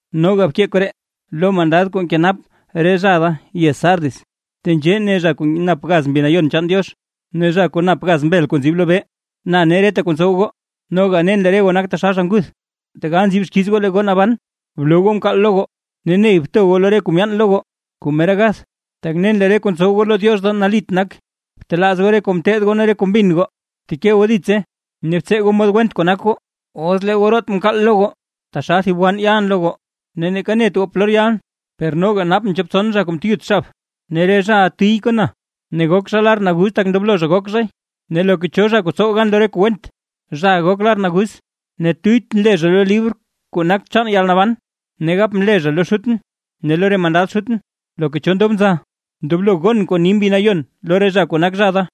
’Noga bkee koree lo mandad kuu nkenap re zha da yez Sardis: “Tenzhee ne zha kuu nap gaz Mbi Nayon chaan Diox ne zha kuu nap gaz mbel kuu nzib lobee: Na ne reta kuu ntsow goo, noga nen lee re goo nak taxal zha nguth, tegal nzib xkiiz goo lee goo naban. Bloo goo mkaal lo goo, ne ney bto goo re kuu myaan lo goo kuu mera gath; tak nen lee re kuu ntsow goo lo Diox da nalit nak. Btelaaz goo re kuu mteed goo ne re kuu mbin goo; bteke goo ditse ne btsee goo mod went kuu nak goo. Os lee goo root mkaal lo goo, taxal thib wann yalʼn lo goo, ne neeka net goo polor yalʼn. Per noga nap goo chop tson zha kuu mteyut xab, ne re zhaʼa tiy kon na, ne gok zha lar naguz tak ndoblo zha gok zhay. Ne loka cho zha kuu tsow gan lo re kuu went, zhaʼa gok lar naguz, ne tuyytʼn le zha lo libr kuu nak chaan yalnaban, ne gapʼn le zha lo Xutʼn ne lo re mandad Xutʼn. ¡Loka cho ndob nza, ndoblo gon kuu ni Mbi Nayon lo re zha kuu nak zha da!”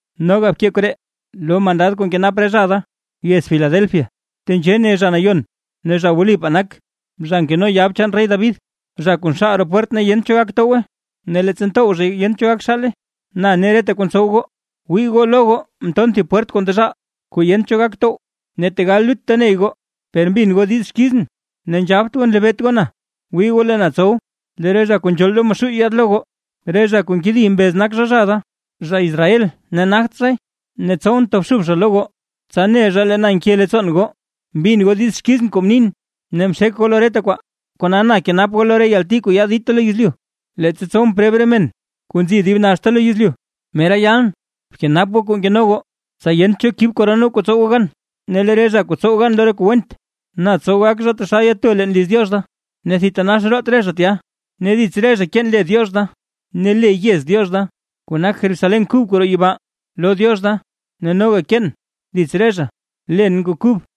’Noga bkee koree lo mandad kuu nkenap re zha da yez Filadelfia: “Tenzhee ne zha Nayon ne zha wlipaa nak, zha nkeno yab chaan rey David, zha kuu nxaal roo pwert ne yent cho gak towgwe, ne leettsa ntow zhay yent cho gak xaale: Na ne reta kuu ntsow goo. Wii goo lo goo mton thib pwert kuu ndezhaal kuu yent cho gak tow. Ne tegal lutta ney goo, per mbin goo diiz xkizʼn ne nzhabt goo nlebeet goo na. Wii goo lee na tsow lee re zha kuu nzhool lo Maxuuy yaad lo goo, re zha kuu nkedi mbez zha nak zha, zha Israel ne nagt zhay, ne tsowʼn tobxub zha lo goo, tsa ne zha lee na nke leettsoon goo. Mbin goo diiz xkizʼn kuu mnin, ne mxek goo lo reta kwaa, kona na kenap goo lo re yalti kuu yaad dita lo yezlyu, leettsa tsowʼn preb re men kuu nzi dib naxta lo yezlyu. Mera yalʼn. Bkenap goo kuu nkeno goo, tsa yent cho kib koron goo kuu tsow goo gan. Ne lee re zha kuu tsow gan lo re kuu went, na tsow gak re zha taxal yato leen liz Diox da, ne thitanax root re zha tya; ne dits re zha keen le Diox da ne le yez Diox da, kuu nak Jerusalén kuu kub kuu roo yibaa lo Diox da; ne noga keen dits re zha, len kuu kub.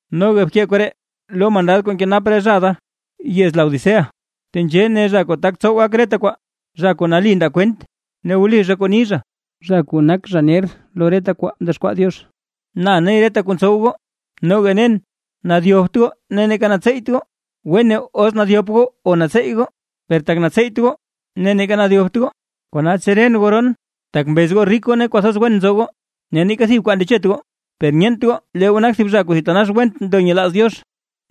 ’Noga bkee koree lo mandad kuu nkenap re zha da yez Laodicea: “Tenzhee ne zha kuu tak tsow gak reta kwaa, zha kuu nali ndaa kwent ne wli zha kuu ni zha, zha kuu nak zha ner lo reta kwaa mdexkwaa Diox: Na ne reta kuu ntsow goo. Noga nen nadyopt goo ne neeka natseeyt goo. ¡Wene os nadyop goo o natseey goo! Per tak natseyt goo, ne neeka nadyopt goo, kona tseren goo roon. Tak mbez goo rik goo ne kwathoz wen nzo goo, ne neeka thib kwaa ndechet goo; per nyeent goo lee goo nak zha kuu thitanax went ndo nyelaaz Diox,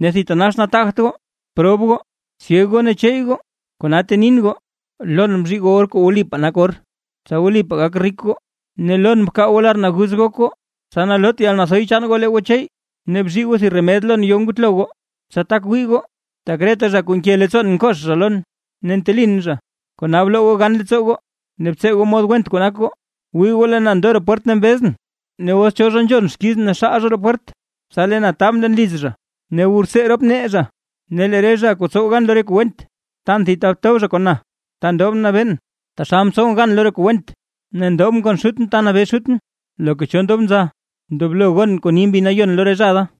ne thitanax nataagt goo, prob goo, syeg goo ne cheey goo. Kona tenin goo: Lon bzhii goo or kuu wlipaa nak or, tsa wlipaa gak rik goo; ne lon bkaa goo lar naguz gok goo, tsa loot yalnathoy chaan goo lee goo cheey; ne bzhii goo thib remed lon yo ngutlo goo, tsa tak wii goo. Tak reta zha kuu nke leettsoon nkox zha lon, ne ntelin zha, kona bloo goo gan leettsoo goo ne btsee goo mod went kuu nak goo. Wii goo lee na ndo roo pwert ne mbezʼn; ne os cho zha nzhon xkizʼn ne xaal zha roo pwert, tsa lee na taabʼn leen liz zha ne wu rtsee rop nee zha. Ne lee re zha kuu tsow gan lo re kuu went, tan thib ta tob zha kon na ta ndobʼn nabeen, taxal mtsowʼn gan lo re kuu went ne ndobʼn kon Xutʼn ta nabee Xutʼn. ¡Loka cho ndob nza, ndoblo gon kuu ni Mbi Nayon lo re zha da!”